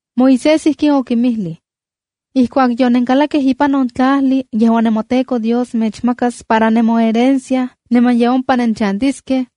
’Moisés ijkin okinmijlij: “Ijkuak yonenkalakkej ipan on tlajli yejuan nemoTEKO Dios mechmakas para nemoherencia niman ye ompa nenchantiskej,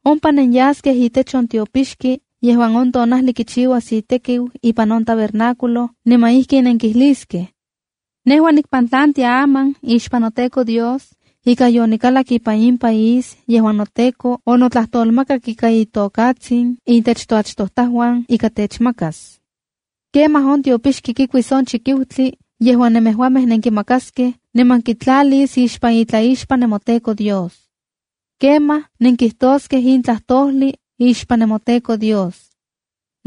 Ompa nenyaskej itech on tiopixki yejuan on tonajli kichiuas itekiu ipan on tabernáculo, niman ijkin nenkijliskej: ‘Nejua nikpantlantia aman ixpan noTEKO Dios ika yonikalak ipan in país yejuan noTEKO onotlajtolmakak ika itokatsin intech toachtojtajuan ika techmakas.’ Kemaj On tiopixki kikuis on chikiutli yejuan nemejuamej nenkimakaskej, niman kitlalis ixpan itlaixpan nemoTEKO Dios. Kemaj nenkijtoskej in tlajtojli ixpan nemoTEKO Dios: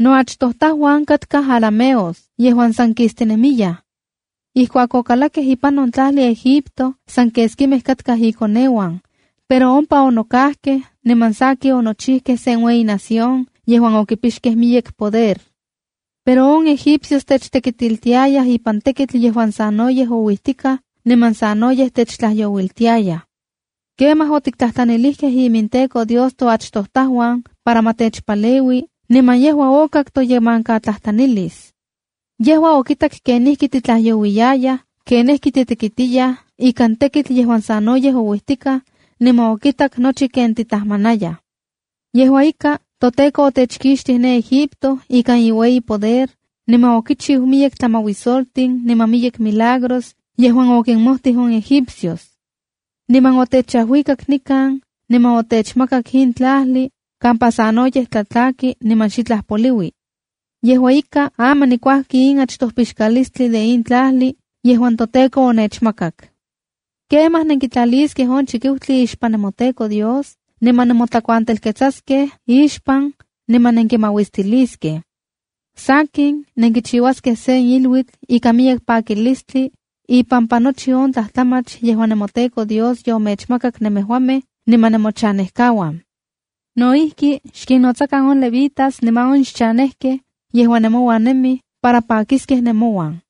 “Noachtojtajuan katkaj arameosa yejuan san kijkistinemiyaj. Ijkuak okalakkej ipan on tlajli Egipto, san keskimej katkaj inkoneuan, pero ompa onokajkej, niman sakin onochijkej sen ueyi nación yejuan okipixkej miyek poder. Pero on egipcios techtekitiltiayaj ipan tekitl yejuan sanoyej ouijtikaj niman sanoyej techtlajyouiltiayaj. Kemaj otiktlajtlanilijkej iminTEKO Dios toachtojtajuan para ma techpaleui, niman yejua okak toyemankatlajtlanilis. Yejua okitak kenijki techtlajyouiltiayaj, kenijki titekitiyaj ikan tekitl yejuan sanoyej ouijtikaj, niman okitak nochi ken titajmanayaj. Yejua ika, toTEKO otechkixtij de Egipto ikan iueyi poder niman okichiu miyek tlamajuisoltin niman miyek milagros yejuan okinmojtij on egipcios. Niman otechajuikak nikan niman otechmakak in tlajli kampa sanoyej tlatlaki niman xitlaj poliui. Yejua ika, aman nikuajki in achtoj pixkalistli de in tlajli yejuan toTEKO onechmakak.’” ’Kemaj nenkitlaliskej on chikiutli ixpan nemoTEKO Dios niman nemotlakuantelketsaskej ixpan niman nenkimauistiliskej. Sakin, nenkichiuaskej sen iluitl ikan miyek pakilistli ipampa nochi on tlajtlamach yejuan nemoTEKO Dios yomechmakak nemejuamej niman nemochanejkauan. No ijki, xkinnotsakan on levitas niman on xchanejkej yejuan nemouan nemij para pakiskej nemouan.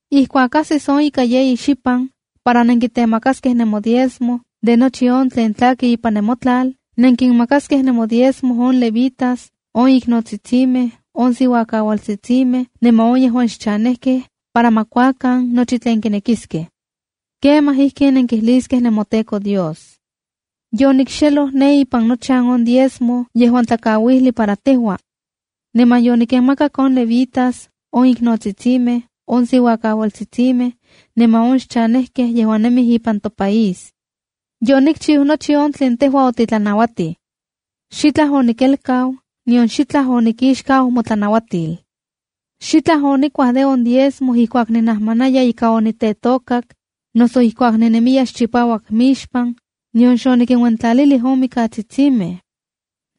’Ijkuak ajsis on ika yeyi xipan para nenkitemakaskej nemodiezmo de nochi on tlen tlaki ipan nemotlal, nenkinmakaskej nemodiezmo on levitas, on iknotsitsimej, on siuakaualtsitsimej, niman on yejuan xchanejkej para ma kuakan nochi tlen kinekiskej. Kemaj ijkin nenkijliskej nemoTEKO Dios: “Yonikxeloj ne ipan nochan on diezmo yejuan tlakauijli para tejua. Niman yonikinmakak on levitas, on iknotsitsimej, on siuakakaualtsitsimej niman on xchanejkej yejuan nemij ipan topaís. Yonikchiu nochi on tlen tejua otitlanauatij. Xitlaj onikelkau, nion xitlaj onikixkau motlanauatil. Xitlaj onikuaj de on diezmo ijkuak ninajmanaya ika onitetokak, noso ijkuak ninemiya xchipauak mixpan, nion xonikinuentlalilij on mikatsitsimej.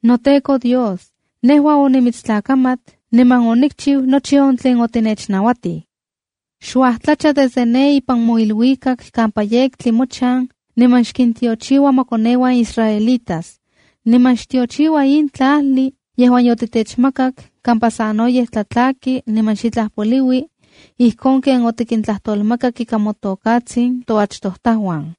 NoTEKO Dios, nejua onimitstlakamat niman onikchiu nochi on tlen otinechnauatij. Xuajtlacha desde ne ipan moiluikak kampa yektli mochan niman xkintiochiua mokoneuan israelitas. Niman xtiochiua in tlajli yejuan yotitechmakak kampa sanoyej tlatlaki niman xitlaj poliui, ijkon ken otikintlajtolmakak ika motokatsin toachtojtajuan.”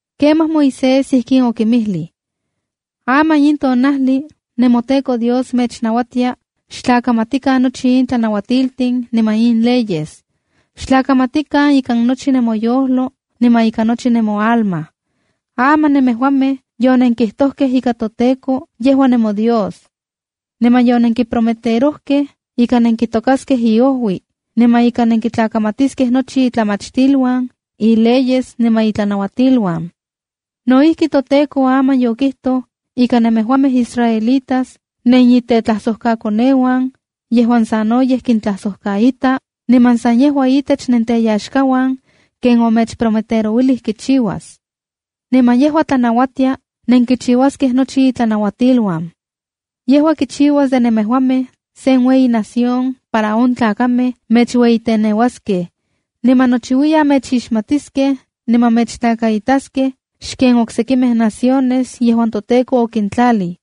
’Kemaj Moisés ijkin okinmijlij: “Aman in tonajli nemoTEKO Dios mechnauatia xtlakamatikan nochi in tlanauatiltin niman in leyes. Xtlakamatikan ikan nochi nemoyojlo niman ikan nochi nemoalma. Aman nemejuamej yonenkijtojkej ika toTEKO, yejua nemoDios. Niman yonenkiprometerojkej ika nenkitokaskej iojui, niman ika nenkitlakamatiskej nochi itlamachtiluan, ileyes niman itlanauatiluan. No ijki, toTEKO aman yokijtoj ika nemejuamej israelitas nenitetlajsojkakoneuan yejuan sanoyej kintlajsojkaita, niman san yejua itech nenteyaxkauan ken omechprometerouilij kichiuas. Niman yejua tlanauatia nenkichiuaskej nochi itlanauatiluan. Yejua kichiuas de nemejuamej sen ueyi nación para on tlakamej mechueyiteneuaskej, niman nochiuiyan mechixmatiskej niman mechtlakaitaskej xken on oksekimej naciones yejuan toTEKO okintlalij.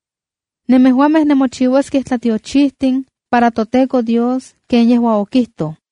Nemejuamej nemochiuaskej tlatiochitin para toTEKO Dios ken yejua okijtoj.”